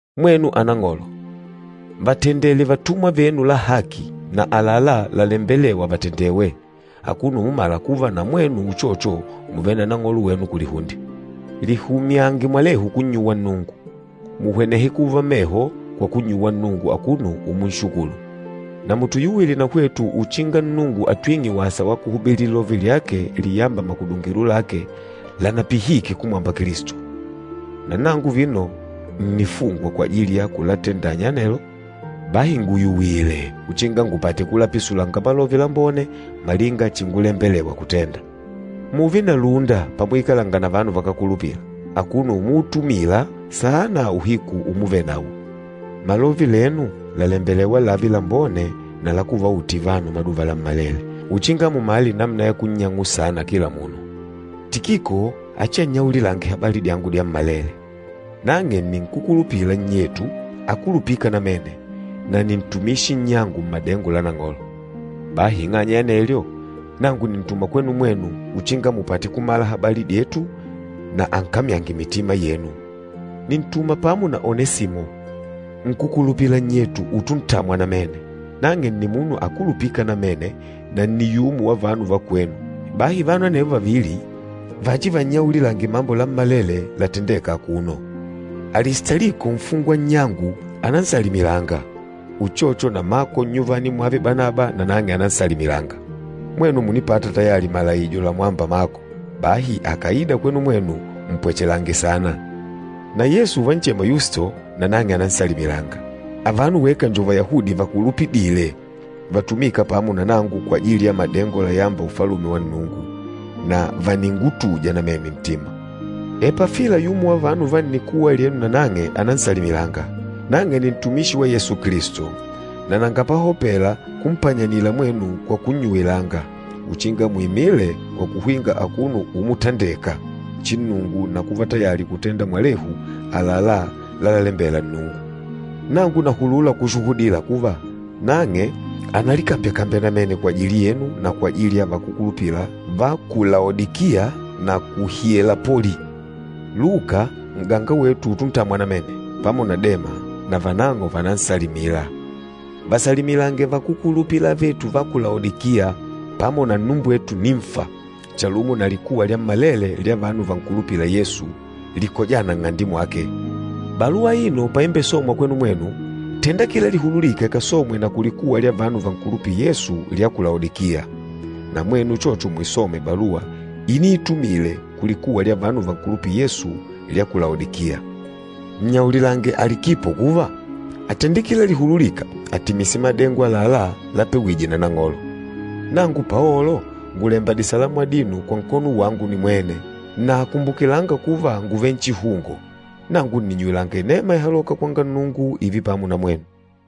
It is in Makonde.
Mwenu anang'olo, vatendele vatumwa venu la haki na àlalá lalembelêwa vatendewe, akuno umumala kuva na mwenu uchocho mùvele na Nang'olo wenu kulihunde. Lihumyange mwalehu kunnyuwanga Nnungu. Muhwenehe kuva meho kwa kunnyuwa Nnungu akuno umunshukulu. Na mutuyuwile na hwetu uchinga Nnungu atwing'e wasa wa kuhubili Lilove lyake liyâmba makudungilo lake lanapihike kumwamba Kilisto. Na nangu vino ǹnifungwa kwajili ya kulatendanya anelo. Bahi nguyuwile uchinga ngupate kulapisulanga Malove Lambone, malinga chingulembelewa kutenda. Mùùve na lúnda pamuikalanga na vanu vakákulupila, akuno umuutumila saana uhiku umuvenawo. Malove lenu làlembelewa lààve lambone na la kuvautila vanu maduva lammalele, uchinga mumale namuna ya kunnyang'ula saana kila munu. Tikiko achiannyaulilange habali dyangu dyammalele. Nang'e nni nkúkulupila nnyetu akulupîka namene na nni ntumishi nnyangu mmadengo la Nang'olo. Bahi ing'anya ya anelyo, nangu nìntuma kwenu mwenu uchinga mupate kumala habali dyetu na ankamyange mitima yenu. Nìntuma pamo na Onesimo, nkúkulupila nnyetu utuntamwa namene. Nang'e nni munu akulupîka namene na nni yumo wa vanu va kwenu. Bahi vanu anevo vavili vachivannyaulilange mambo lammalele latendêka akuno. Alistaliko nfungwa nnyangu ànansalimilanga. Uchocho na Mako nnyuvani mwave Banaba na nang'e ànansalimilanga. Mwenu mùnipata tayali malaijo lamwâmba Mako, bahi akàida kwenu mwenu mpwechelange saana. Na Yesu uvanchema Yusto, nanang'e ànansalimilanga. Avano weka njo Vayahudi vakulupidîle vatumîka pamo na nangu kwajili ya madengo layâmba Ufalume wa Nnungu, na vàningutuja namene ntima. Epafila yumo wa vanu va nnikuwa lyenu nanang'e ànansalimilanga. Nang'e nni ntumishi wa Yesu Kilisto, na nanga pahopela kumpanyanila mwenu kwa kunnyuwilanga uchinga muimile kwa kuhwinga akuno umutandeka chinnungu na kuva tayali kutenda mwalehu àlalá lalalembela Nnungu. Nangu nahulula kushuhudila kuva, nang'e ànalikambyakambya namene kwajili yenu na kwajili ya vakúkulupila va ku Laodikiya na ku Hielapoli. Luka, n'ganga wetu utuntamwa namene, pamo na Dema, na vanang'o vànansalimila. Vasalimilange vakúkulupila avetu va ku Laodikiya, pamo na nnumbwetu Nimfa chalumo na likuwa lyammalele lya vanu vankulupîla Yesu, likojâna nng'ande mwake. Baluwa aino paimbesomwa kwenu mwenu, tenda kila lihululîka ikasomwe na kulikuwa lya vanu vankulupîla Yesu lya ku Laodikiya. Na mwenu uchocho muisome baluwa iniitumile kulikuwa lya vanu vankulupîla Yesu lya ku Laodikiya. Nnyaulilange Alikipo kuva, atende kila lihululîka atimise madengo àlalá lapewije na Nang'olo. Nangu Paolo ngùlemba disalamu adino kwa nkono wangu nimwene. Na kumbukilanga kuva ngùvele nchihungo. Nangu nìnnyuwilanga inema ihalôka kwanga Nnungu ììve pamo na mwenu.